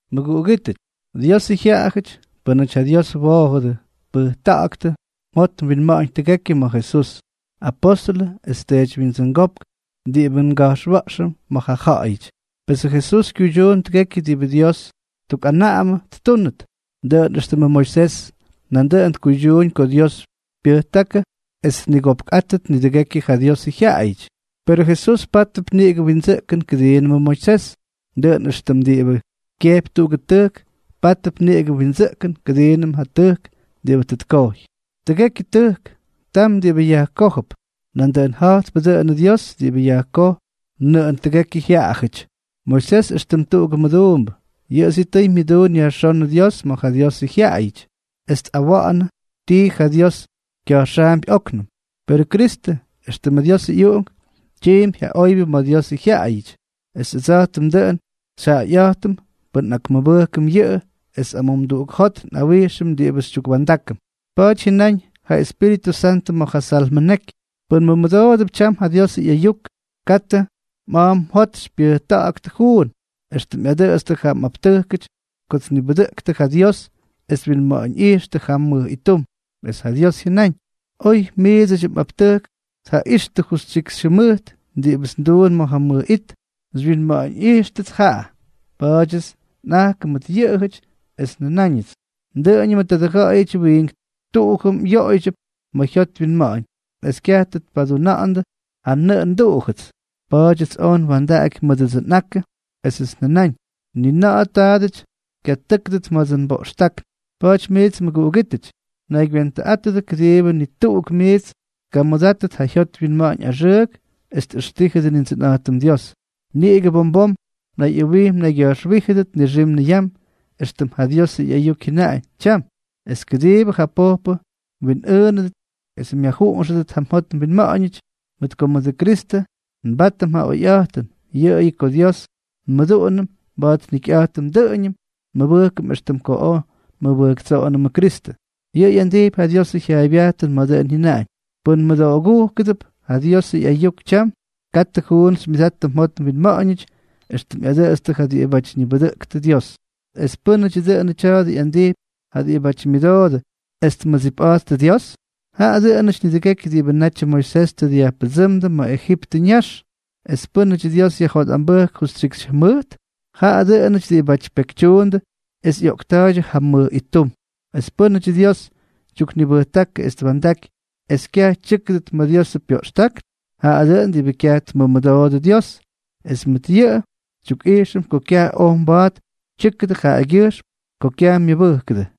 Mʉguꞌugítʉty, Diosʉ jyaꞌayʉty, pʉ́nʉty ja Dios woojʉdʉ, pʉjta̱ꞌa̱ktʉ mjot mwinma̱ꞌa̱ñ tʉgekyʉ ma̱ Jesús, apóstʉlʉ es teedywyindsʉngópk diꞌibʉ nga̱jxwa̱ꞌxʉm ma̱ ja ja̱ꞌa̱yʉty. Pesʉ Jesús kyuydyuun tʉgekyʉ diꞌibʉ Dios tukꞌanaꞌamʉ ttúnʉt, dʉꞌʉn éxtʉmʉ Moisés nandʉꞌʉn tkuydyuuñ ko Dios pyʉjtákʉ es tnigopkꞌátʉt nidʉgekyʉ ja Diosʉ jyaꞌayʉty. Perʉ Jesús pátʉp niꞌigʉ windsʉꞌkʉn kʉdiinʉmʉ Moisés, dʉꞌʉn éxtʉm diꞌibʉ kyejpy tuꞌugʉ tʉjk pátʉp niꞌigʉ windsʉꞌkʉn kʉdiinʉm ja tʉjk diꞌibʉ tʉ tkojy. Tʉgekyʉ tʉjk, tam diꞌibʉ yajkójʉp. Nandʉꞌʉn ja̱jtpʉ dʉꞌʉnʉ Dios diꞌibʉ yajkoj nʉꞌʉn tʉgekyʉ jyaajʉty. Moisés, éxtʉm tuꞌugʉ mʉduumbʉ, yʉꞌʉ sitʉy myʉduun yajxónʉ Dios ma̱ ja Diosʉ jyaꞌayʉty, es tꞌawa̱ꞌa̱nʉ tii ja Dios kya̱jxaampy óknʉm. Perʉ Kristʉ, éxtʉmʉ Diosʉ ꞌyUꞌunk, tyiimpy ja oybyʉ ma̱ Diosʉ jyaꞌayʉty, es ʉdsa̱jtʉm dʉꞌʉn xyjaꞌayꞌa̱jtʉm pʉn nꞌakmʉbʉjkʉm yʉꞌʉ es amumduꞌuk jot nꞌawijxʉm diꞌibʉ xytyukwa̱ndákʉm. Pa̱a̱ty jyʉnaꞌañ ja Espíritʉ Santʉ ma̱ ja Salmʉ neky: Pʉn mmʉdoodʉp tyam ja Diosʉ ꞌyayuk, katʉ mꞌa̱a̱ mjot xypyʉjta̱ꞌa̱ktʉ juun, éxtʉm ꞌyadʉtstʉ ja mꞌaptʉjkʉty ko tnibʉdʉꞌktʉ ja Dios es twinma̱ꞌa̱ñꞌijxtʉ jam mʉj ittum. Es ja Dios jyʉnáñ: Oy miidsʉdyʉ mꞌaptʉjk tjaꞌijxtʉ justyikxy jʉmʉjt diꞌibʉts nduun ma̱ ja mʉj it, xywyinma̱ꞌa̱ñꞌijxtʉts jaꞌa. Pa̱a̱dyʉts nꞌajkʉ mʉt yʉꞌʉjʉty, es njʉnáñʉts: “Dʉꞌʉñʉmʉ tadʉ ja̱ꞌa̱yʉty wiink tuꞌujʉm yoꞌoydyʉp ma̱ jyot wyinma̱ꞌa̱ñ, es kyaj tʉ tpaduna̱ꞌa̱ndʉ ja nnʉꞌʉ nduꞌujʉts.” Pa̱a̱dyʉts oj nwa̱ndaꞌaky mʉdʉdsʉ nꞌakʉ, esʉts njʉnáñ: “Ni na̱ꞌa̱ taadʉty kyatʉ́kʉdʉt ma̱dsʉ nboꞌxtákn.” Pa̱a̱ty miits mʉguꞌugítʉty, naygywentʉꞌátʉdʉ kʉdiibʉ ni tuꞌuk miits tkamʉdátʉt ja jyot wyinma̱ꞌa̱ñ axʉʉk es tꞌʉxtíjʉdʉ Nindsʉnꞌa̱jtʉm Dios. Niꞌigʉ bom bom mnayꞌʉwij mnaygya̱jxwíjʉdʉt nixim niyam, éxtʉm ja Diosʉ ꞌyayuk jyʉnaꞌañ “tyam”, es kʉdiibʉ ja pojpʉ mwinꞌʉʉnʉdʉt es myajjuꞌunxʉdʉt ja mjot mwinma̱ꞌa̱ñʉty. Mʉt ko mʉdʉ Kristʉ nbátʉm ja oyꞌa̱jtʉn, yʉꞌʉyʉ ko Dios nmʉduꞌunʉm maba̱a̱t njikyꞌa̱jtʉm, dʉꞌʉñʉm nmʉbʉjkʉm éxtʉm ko oj nmʉbʉjktsoꞌonʉmʉ Kristʉ. Yʉꞌʉ ꞌyandijpy ja Diosʉ jyaaybyajtʉn ma̱ dʉꞌʉn jyʉnaꞌañ: Pʉn mmʉdoogujkʉdʉp ja Diosʉ ꞌyayuk tyam, katʉ juun xymyʉdattʉ mjot mwinma̱ꞌa̱ñʉty éxtʉm ꞌyadʉtstʉ ja diꞌibáty ñibʉdʉꞌktʉ Dios. ¿Es pʉ́nʉdyʉ dʉnʉ tya̱a̱dʉ ꞌyandijpy ja diꞌibáty myʉdoodʉ es tmʉdsipꞌa̱jttʉ Dios? Jaꞌa dʉꞌʉnʉty nidʉgekyʉ diꞌibʉ natyʉ Moisés tʉ dyajpʉdsʉ́mdʉ ma̱ Ejiptʉ ñax. ¿Es pʉ́nʉdyʉ Dios yajjotꞌambʉjk justyikxy jʉmʉjt? Jaꞌa dʉꞌʉnʉty diꞌibáty pekytyuundʉ es ꞌyoꞌkta̱a̱ydyʉ jam mʉj ittum. ¿Es pʉ́nʉdyʉ Dios tyuknibʉjtákʉ es twa̱ndaky es kyaj tyʉ́kʉdʉt ma̱ Diosʉ pyoꞌxtákn? Jaꞌa dʉꞌʉn diꞌibʉ kyaj tmʉmʉdoodʉ Dios. Es mʉt yʉꞌʉ Dios xytyukꞌijxʉm ko kyaj oj mba̱a̱t tyʉ́kʉdʉ jaꞌagyʉjxm ko kyaj myʉbʉjkʉdʉ.